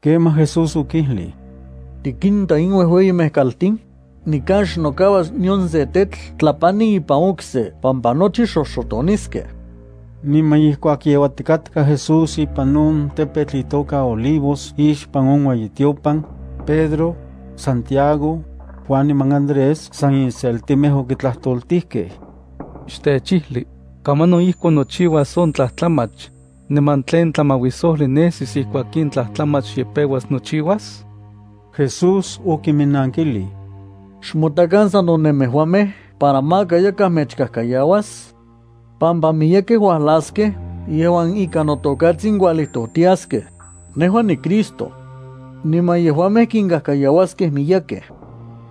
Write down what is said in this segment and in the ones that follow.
Kemaj Jesús okijlij: —¿Tikinta in uejueyimej kaltin? Nikan xnokauas nion se tetl tlapani ipan okse pampa nochi xoxotoniskej. Niman ijkuak yeuatikatka Jesús ipan on tepetl itoka Olivos ixpan on ueyitiopan, Pedro, Santiago, Juan niman Andrés san inseltimej okitlajtoltijkej: —Xtechijli, ¿kamanon ijkon nochiuas on tlajtlamach, niman tlen tlamauisojli nesis ijkuak in tlajtlamach ye peuas nochiuas? Jesús okiminnankilij: —Xmotakan sano nemejuamej para maka yakaj mechkajkayauas, pampa miyekej uajlaskej yejuan ikan noTokatsin kualijtojtiaskej: “Nejua niCristo.” Niman yejuamej kinkajkayauaskej miyekkej.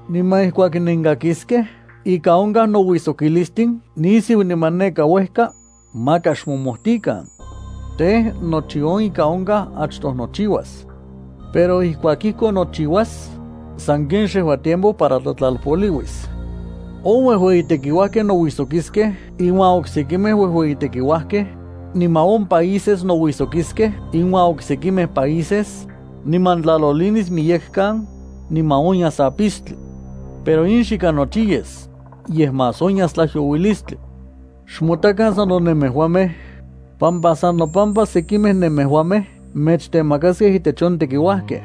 ’Niman ijkuak nenkakiskej ika onkaj nouijsokilistin nisiu niman neka uejka, maka xmojmotikan. Tej, nochi on ika onkaj achtoj nochiuas. Pero ijkuak ijkon nochiuas, sanken xejua tiempo para tlatlalpoliuis. On uejueyitekiuajkej nouijsokiskej inuan oksekimej uejueyitekiuajkej, niman on países nouijsokiskej inuan oksekimej países, niman tlalolinis miyekan, niman onyas apistli. Pero in xika nochi yes, yej más onyas tlajyouilistli. ’Xmotakan sano nemejuamej, pampa san nopampa sekimej nemejuamej mechtemakaskej intech on tekiuajkej,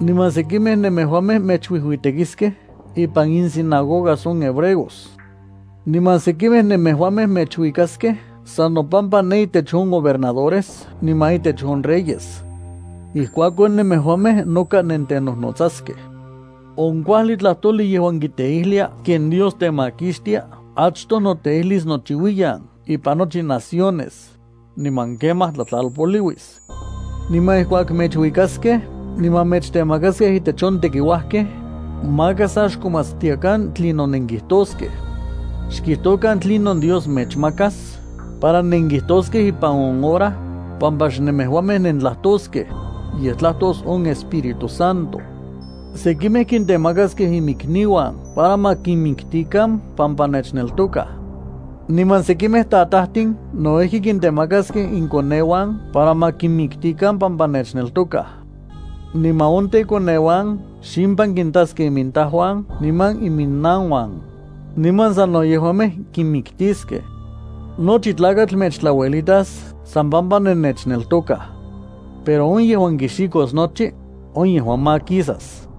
niman sekimej nemejuamej mechuijuitekiskej ipan insinagogas on hebreos. Niman sekimej nemejuamej mechuikaskej san nopampa ne intech on gobernadores niman intech on reyes. Ijkuakon nemejuamej noka nentenojnotsaskej. On kuajli tlajtojli yejuan kiteijlia ken Dios temakixtia achtoj noteijlis nochiuiyan ipan nochi naciones, niman kemaj tlatlalpoliuis. Niman ijkuak mechuikaskej niman mechtemakaskej intech on tekiuajkej, maka sa xkomatstiakan tlinon nenkijtoskej. Xkijtokan tlinon Dios mechmakas para nenkijtoskej ipan on hora, pampa xnemejuamej nentlajtoskej, yej tlajtos on Espíritu Santo. Sekimej kintemakaskej imikniuan para ma kinmiktikan pampa nechneltokaj. Niman sekimej tatajtin no ijki kintemakaskej inkoneuan para ma kinmiktikan pampa nechneltokaj. Niman on tekoneuan ximpan kitaskej imintajuan niman iminnanuan, niman sano yejuamej kinmiktiskej. Nochi tlakatl mechtlauelitas san pampa nennechneltokaj. Pero on yejuan kixikos nochi, on yejua makisas.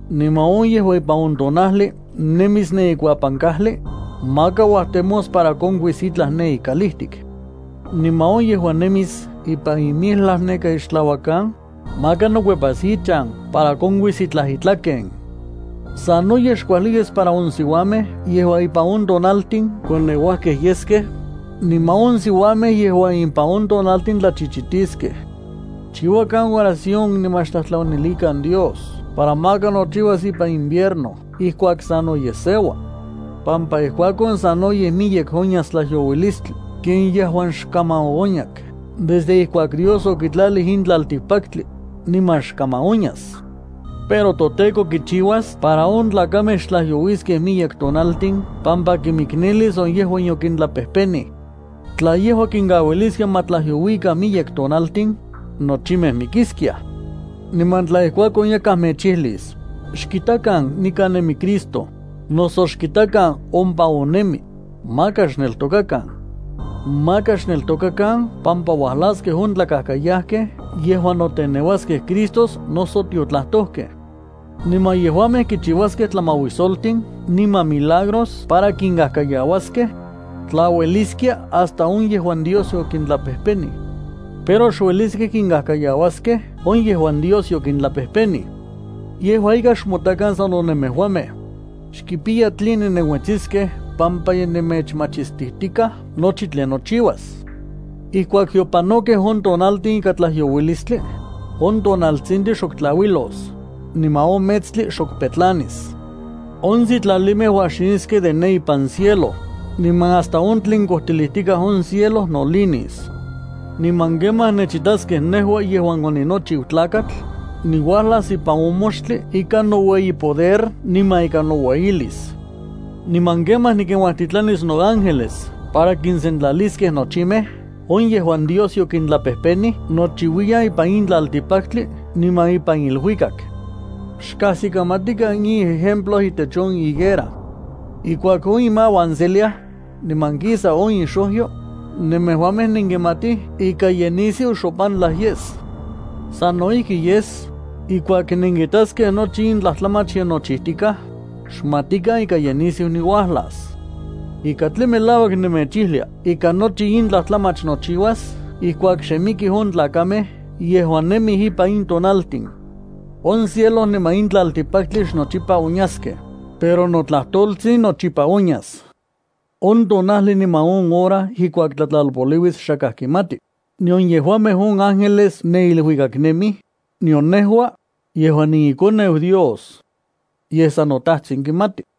Niman on yejuan ipan on tonajli nemis ne ikuapan kajli, maka uajtemos para konkuis itlaj ne ikalijtik. Niman on yejuan nemis neka ipan capo, maka nokuepas ichan para konkuis itlaj itlaken. Sanoyej xkuajli yes para on siuamej yejuan ipan on tonaltin koneuajkej yeskej, niman on siuamej yejuan ipan on tonaltin tlachichitiskej. Xchiuakan oración niman xtlajtlanilikan Dios para maka nochiuas ipan invierno ijkuak sanoyej seua, pampa ijkuakon sanoyej miyek onyas tlajyouilistli ken yejuan xkaman oonyak desde ijkuak Dios okitlalij in tlaltikpaktli, niman xkaman onyas. Pero toTEKO kichiuas para on tlakamej xtlajyouiskej miyek tonaltin pampa kimiknelis on yejuan yokintlapejpenij. Tla yejua kinkauiliskia ma tlajyouikan miyek tonaltin, nochimej mikiskiaj. ’Niman tla ijkuakon yakaj mechijlis: “Xkitakan, nikan nemi Cristo”, noso “Xkitakan, ompa on nemi”, maka xneltokakan. Maka xneltokakan pampa uajlaskej on tlakajkayajkej yejuan noteneuaskej Cristos noso tiotlajtojkej. Niman yejuamej kichiuaskej tlamauisoltin niman milagros para kinkajkayauaskej tlaueliskia hasta on yejuan Dios okintlapejpenij. Pero xueliskej kinkajkayauaskej on yejuan Dios yokintlapejpenij. Yejua ika xmotakan sano nemejuamej. Xkipiya tline nenuetsiskej pampa ye nemechmachistijtikaj nochi tlen nochiuas. ’Ijkuak yopanokej on tonaltin ikan tlajyouilistli, on tonaltsintli xok tlauilos, niman on metstli xok petlanis. On sitlalimej uajxiniskej de ne ipan cielo, niman hasta on tlen kojtilijtikaj on cielo nolinis. ’Niman kemaj nechitaskej nejua yejuan oninochiu Tlakatl, niuajlas ipan on moxtli ikan noueyi poder niman ikan noueyilis. Niman kemaj nikinuajtitlanis noángeles para kinsentlaliskej nochimej on yejuan Dios yokintlapejpenij nochiuiyan ipan in tlaltikpaktli niman ipan iluikak. ’Xkajsikamatikan in ejemplo itech on higuera. Ijkuak on imauan seliaj, niman kisa on ixojyo, nemejuamej nenkimatij ika ye nisiu xopantlaj yes. Sano ijki yes, ijkuak nenkitaskej nochi in tlajtlamach ye nochijtikaj, xmatikan ika ye nisiu niuajlas. Ika tlen melauak nemechijlia ika nochi in tlajtlamach nochiuas ijkuak xe mikij on tlakamej yejuan nemij ipan in tonaltin. On cielo niman in tlaltikpaktli xnochipa onyaskej, pero notlajtoltzin nochipa onyas. ’On tonajli niman on hora ijkuak tlatlalpoliuis xakaj kimati, nion yejuamej on ángeles ne iluikak nemij, nion nejua, yejuan niiKoneu Dios. Yej san noTajtsin kimati.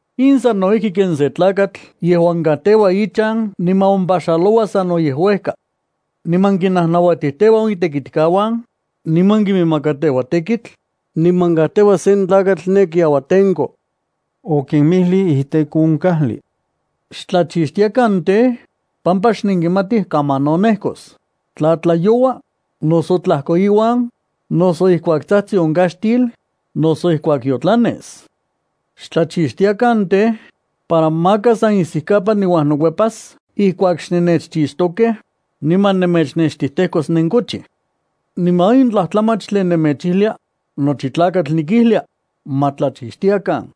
In sano ijki ken sen tlakatl yejuan kajteua ichan niman ompaxaloua sanoyej uejka. Niman kinnajnauatijteua on itekitkauan, niman kiminmakateua tekitl, niman kajteua sen tlakatl ne kiauatenko para ma tlacuidaro. Okimijlij iteko on kajli: “Xtlachixtiakan tej, pampa xnenkimatij kamanon nejkos, tla tlayoua, noso tlajkoiuan, noso ijkuak tsajtsi on kaxtil, noso ijkuak yotlanes.” Xtlachixtiakan tej, para maka san isikapan niuajnokuepas ijkuak xnennechchixtokej, niman nemechnextijtejkos nenkochij. Niman in tlajtlamach tlen nemechijlia, nochi tlakatl nikijlia: “Ma tlachixtiakan.”